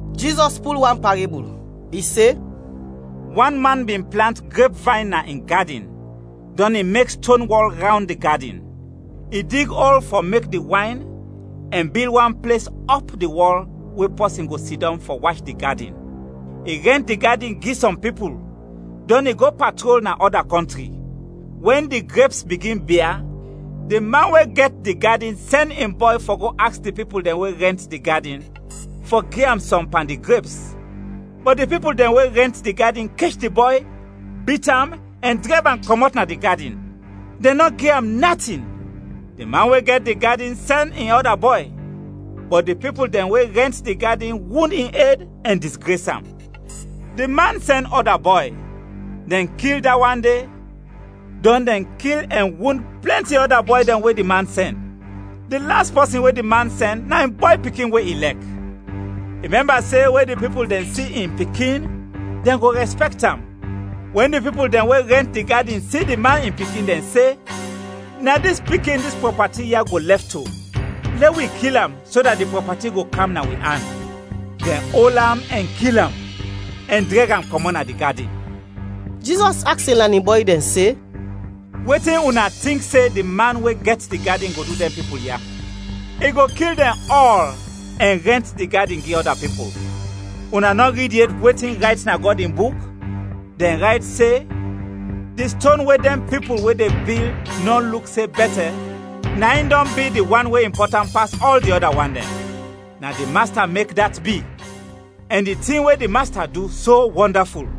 Jizɔs pul wan parebul; i se, “Wan man bin plant grepvayn na in gadin, dɔn i mek ston wɔl rawnd di gadin. I dig ol fɔ mek di wayn ɛn bil wan ples ɔp di wɔl we pɔsin go sidɔm fɔ wach di gadin. I rɛnt di gadin gi sɔm pipul, dɔn i go patrol na ɔda kɔntri. Wɛn di greps bigin bia, di man we gɛt di gadin sɛn in bɔy fɔ go aks di pipul dɛn we rɛnt di gadin fɔ gi am sɔm pan di greps. Bɔt di pipul dɛn we rɛnt di gadin kech di bɔy, bit am ɛn drɛb am kɔmɔt na di gadin, dɛn nɔ gi am natin. Di man we gɛt di gadin sɛn in ɔda bɔy, bɔt di pipul dɛn we rɛnt di gadin wund in ed ɛn disgres am. Di man sɛn ɔda bɔy, dɛn kil da wan de; dɔn dɛn kil ɛn wund plɛnti ɔda bɔy dɛn we di man sɛn. Di las pɔsin we di man sɛn na in bɔy pikin we i lɛk. I mɛmba se we di pipul dɛn si in pikin, dɛn go rɛspɛkt am. Wɛn di pipul dɛn we rɛnt di gadin si di man in pikin, dɛn se, ‘Na dis pikin dis prɔpati ya go lɛf to, lɛ wi kil am, so dat di prɔpati go kam na wi an.’ Dɛn ol am ɛn kil am, ɛn drɛg am kɔmɔt na di gadin.” Jizɔs aks in lanin bɔy dɛn se, “Wetin una tink se di man we gɛt di gadin go du dɛn pipul ya? I go kil dɛn ɔl ɛn rɛnt di gadin gi ɔda pipul. Una nɔ rid yet wetin rayt na Gɔd in Buk? Dɛn rayt se, ‘Di ston we dɛn pipul we de bil nɔ luk se bɛtɛ, na in dɔn bi di wan we impɔtant pas ɔl di ɔda wan dɛn. Na di Masta mek dat bi; ɛn di tin we di Masta du, so wɔndaful!’”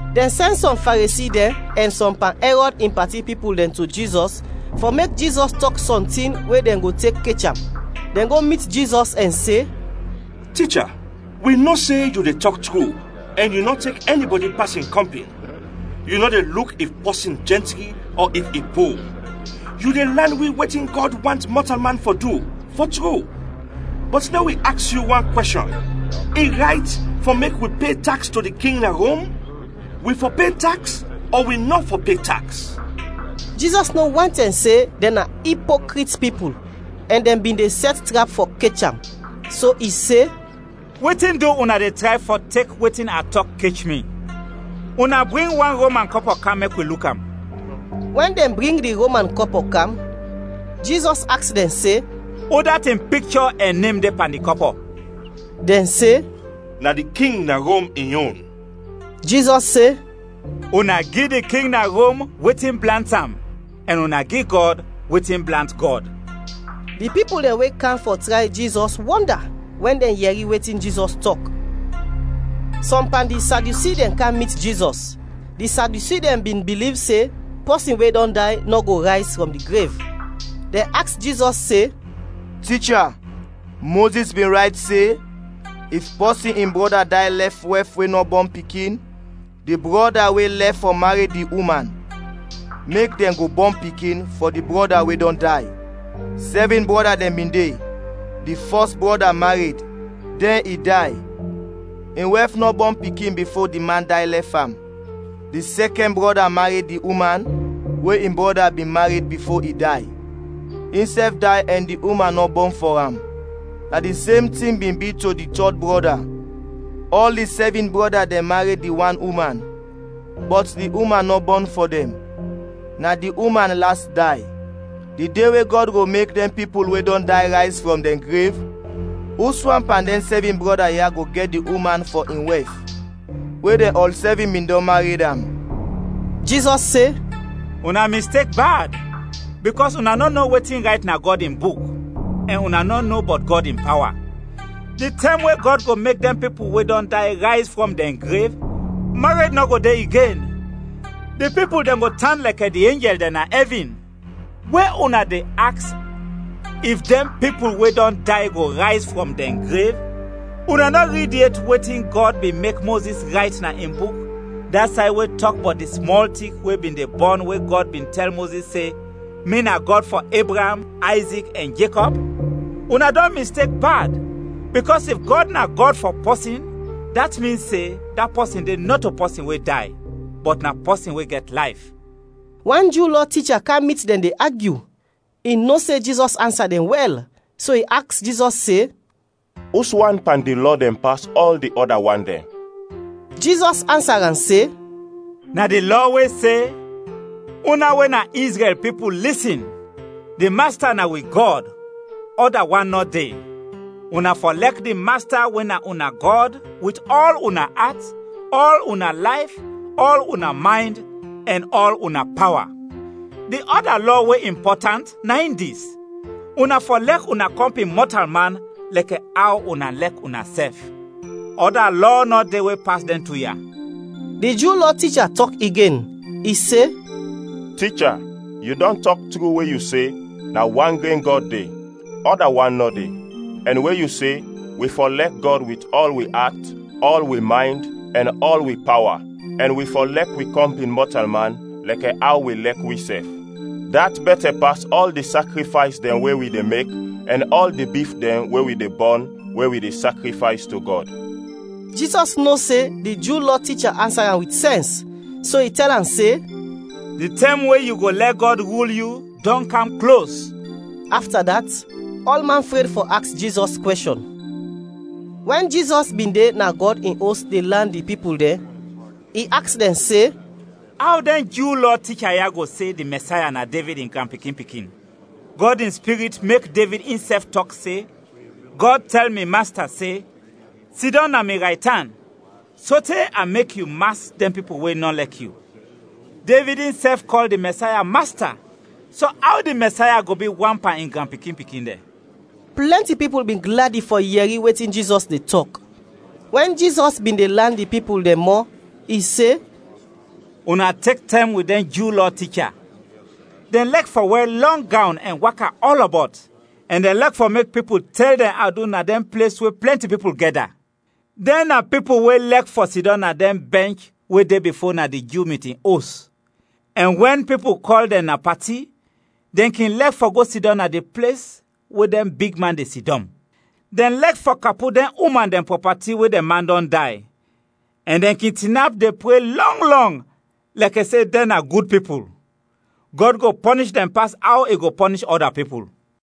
Dɛn sɛn sɔm Faresi dɛn ɛn sɔm pan Ɛrɔd in pati pipul dɛn to Jizɔs fɔ mek Jizɔs tɔk sɔntin we dɛn go tek kech am. Dɛn go mit Jizɔs ɛn se, “Ticha, wi no se yu de tɔk tru ɛn yu nɔ tek ɛnibɔdi pas in kɔmpin, yu nɔ de luk if pɔsin jɛntri ɔ if i po. Yu de lan wi wetin Gɔd want mɔtalman fɔ du, fɔ tru, bɔt lɛ wi aks yu wan kwɛshɔn. I rayt fɔ mek wi pe taks to di king na Rom? Wi fɔ pe taks ɔ wi nɔ fɔ pe taks?” Jizɔs no wantɛm se dɛn na ipokrit pipul, ɛn dɛn bin de sɛt trap fɔ kech am, so i se, “Wetin du una de tray fɔ tek wetin a tɔk kech mi? Una bring wan Roman kɔpɔ kam mek wi luk am.” Wɛn dɛn bring di Roman kɔpɔ kam, Jizɔs aks dɛn se, “Udat in pikchɔ ɛn nem de pan di kɔpɔ?” Dɛn se, “Na di king na Rom in yon.” Jizɔs se, “Una gi di king na Rom wetin blant am ɛn una gi Gɔd wetin blant Gɔd.” Di pipul dɛn we kam fɔ tray Jizɔs wɔnda wɛn dɛn yɛri wetin Jizɔs tɔk. Sɔm pan di Sadyusi dɛn kam mit Jizɔs; di Sadyusi dɛn bin biliv se pɔsin we dɔn day nɔ go rayz frɔm di grev. Dɛn aks Jizɔs se, “Ticha, Mozis bin rayt se, ‘If pɔsin in brɔda day lɛf wɛf we nɔ bɔn pikin, di brɔda we lɛf fɔ mared di uman, mek dɛn go bɔn pikin fɔ di brɔda we dɔn day.’ Sɛvin brɔda dɛn bin de, di fɔs brɔda mared, dɛn i day, in wɛf nɔ bɔn pikin bifo di man day lɛf am. Di sɛkɛn brɔda mared di uman we in brɔda bin mared bifo i day, insɛf day ɛn di uman nɔ bɔn fɔ am. Na di sem tin bi to di tɔd brɔda. Ɔl di sɛvin brɔda dɛn mared di wan uman, bɔt di uman nɔ bɔn fɔ dɛn. Na di uman las day. Di de we Gɔd go mek dɛn pipul we dɔn day rayz frɔm dɛn grev, uswan pan dɛn sɛvin brɔda ya go gɛt di uman fɔ in wɛf, we dɛn ɔl sɛvin bin dɔn mared am?” Jizɔs se, “Una mistek bad, bikɔs una nɔ no wetin rayt na Gɔd in Buk, ɛn una nɔ no bɔt Gɔd in pawa. Di tɛm we Gɔd go mek dɛn pipul we dɔn day rayz frɔm dɛn grev, mared nɔ go de igen, di pipul dɛn go tan lɛkɛ di enjɛl dɛn na ɛvin. We una de aks if dɛn pipul we dɔn day go rayz frɔm dɛn grev, una nɔ rid yet wetin Gɔd bin mek Mozis rayt na in Buk, da say we tɔk bɔt di smɔl tik we bin de bɔn we Gɔd bin tɛl Mozis se, ‘Mi na Gɔd fɔ Ebraam, Ayzik, ɛn Jekɔb?’ Una dɔn mistek bad, bikɔs if Gɔd na Gɔd fɔ pɔsin dat min se da pɔsin de nɔto pɔsin we day, bɔt na pɔsin we gɛt layf.” Wan Ju Lɔ ticha kam mit dɛn de agyu, i no se Jizɔs ansa dɛn wɛl, so i aks Jizɔs se, “Uswan pan di lɔ dɛn pas ɔl di ɔda wan dɛn?” Jizɔs ansa am se, “Na di lɔ we se, ‘Una we na Izrɛl pipul, lisin! Di Masta na wi Gɔd, ɔda wan nɔ de. Una fɔ lɛk di Masta we na una Gɔd wit ɔl una at, ɔl una layf, ɔl una maynd, ɛn ɔl una pawa.’ Di ɔda lɔ we impɔtant na in dis, ‘Una fɔ lɛk una kɔmpin mɔtalman lɛkɛ aw una lɛk unasɛf.’ Ɔda lɔ nɔ de we pas dɛn tu ya.” Di Ju Lɔ ticha tɔk igen, i se, “Ticha, yu dɔn tɔk tru we yu se, na wan gren Gɔd de, ɔda wan nɔ de. Ɛn we yu se, wi fɔ lɛk Gɔd wit ɔl wi at, ɔl wi maynd, ɛn ɔl wi pawa, ɛn wi fɔ lɛk wi kɔmpin mɔtalman lɛkɛ aw wi lɛk wisɛf. Dat bɛtɛ pas ɔl di sakrifays dɛn we wi de mek ɛn ɔl di bif dɛn we wi de bɔn we wi de sakrifays to Gɔd.” Jizɔs no se di Ju Lɔ ticha ansa am wit sɛns, so i tɛl am se, “Di tɛm we yu go lɛ Gɔd rul yu dɔn kam klos.” Afta dat, ɔlman fred fɔ aks Jizɔs kwɛshɔn. Wɛn Jizɔs bin de na Gɔd in Os de lan di pipul dɛn, i aks dɛn se, “Aw dɛn Ju Lɔ ticha ya go se di Mɛsaya na Devid in granpikin-pikin? Gɔd in Spirit mek Devid insɛf tɔk se, ‘Gɔd tɛl mi Masta se: Sidɔm na mi raytan, sote a mek yu mas dɛn pipul we nɔ lɛk yu.’ “Devid insɛf kɔl di Mɛsaya, ‘Masta,’ so aw di Mɛsaya go bi wan pan in granpikin-pikin dɛn?” Plɛnti pipul bin gladi fɔ yɛri wetin Jizɔs de tɔk. Wɛn Jizɔs bin de lan di pipul dɛn mɔ, i se, “Una tek tɛm wit dɛn Ju Lɔ ticha, dɛn lɛk fɔ wɛr lɔng gawn ɛn waka ɔlɔbɔt ɛn dɛn lɛk fɔ mek pipul tɛl dɛn adu na dɛn ples we plɛnti pipul gɛda. Dɛn na pipul we lɛk fɔ sidɔm na dɛn bɛnch we de bifo na di Ju mitin os, ɛn wɛn pipul kɔl dɛn na pati, dɛn kin lɛk fɔ go sidɔm na di ples we dɛn bigman de sidɔm. Dɛn lɛk fɔ kapu dɛn uman dɛn prɔpati we dɛn man dɔn day, ɛn dɛn kin tinap de pre lɔng lɔng lɛkɛ se dɛn na gud pipul. Gɔd go pɔnish dɛn pas aw i go pɔnish ɔda pipul!”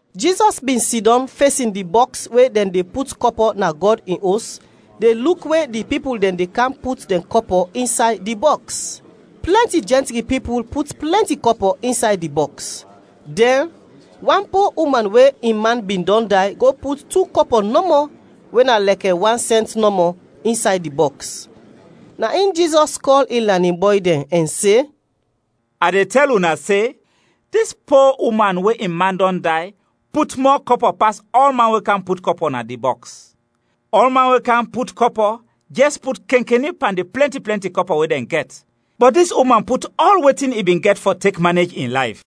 Jizɔs bin sidɔm fesin di bɔks we dɛn de put kɔpɔ na Gɔd in Os de luk we di pipul dɛn de kam put dɛn kɔpɔ insay di bɔks. Plɛnti jɛntri pipul put plɛnti kɔpɔ insay di bɔks. Dɛn wan po uman we in man bin dɔn day go put tu kɔpɔ nɔmɔ we na lɛkɛ wan sɛnt nɔmɔ, insay di bɔks. Na in Jizɔs kɔl in lanin bɔy dɛn ɛn se, “A de tɛl una se, dis po uman we in man dɔn day put mɔ kɔpɔ pas ɔlman we kam put kɔpɔ na di bɔks. Ɔlman we kam put kɔpɔ jɛs put kenkeni pan di plɛnti plɛnti kɔpɔ we dɛn gɛt, bɔt dis uman put ɔl wetin i bin gɛt fɔ tek manej in layf.”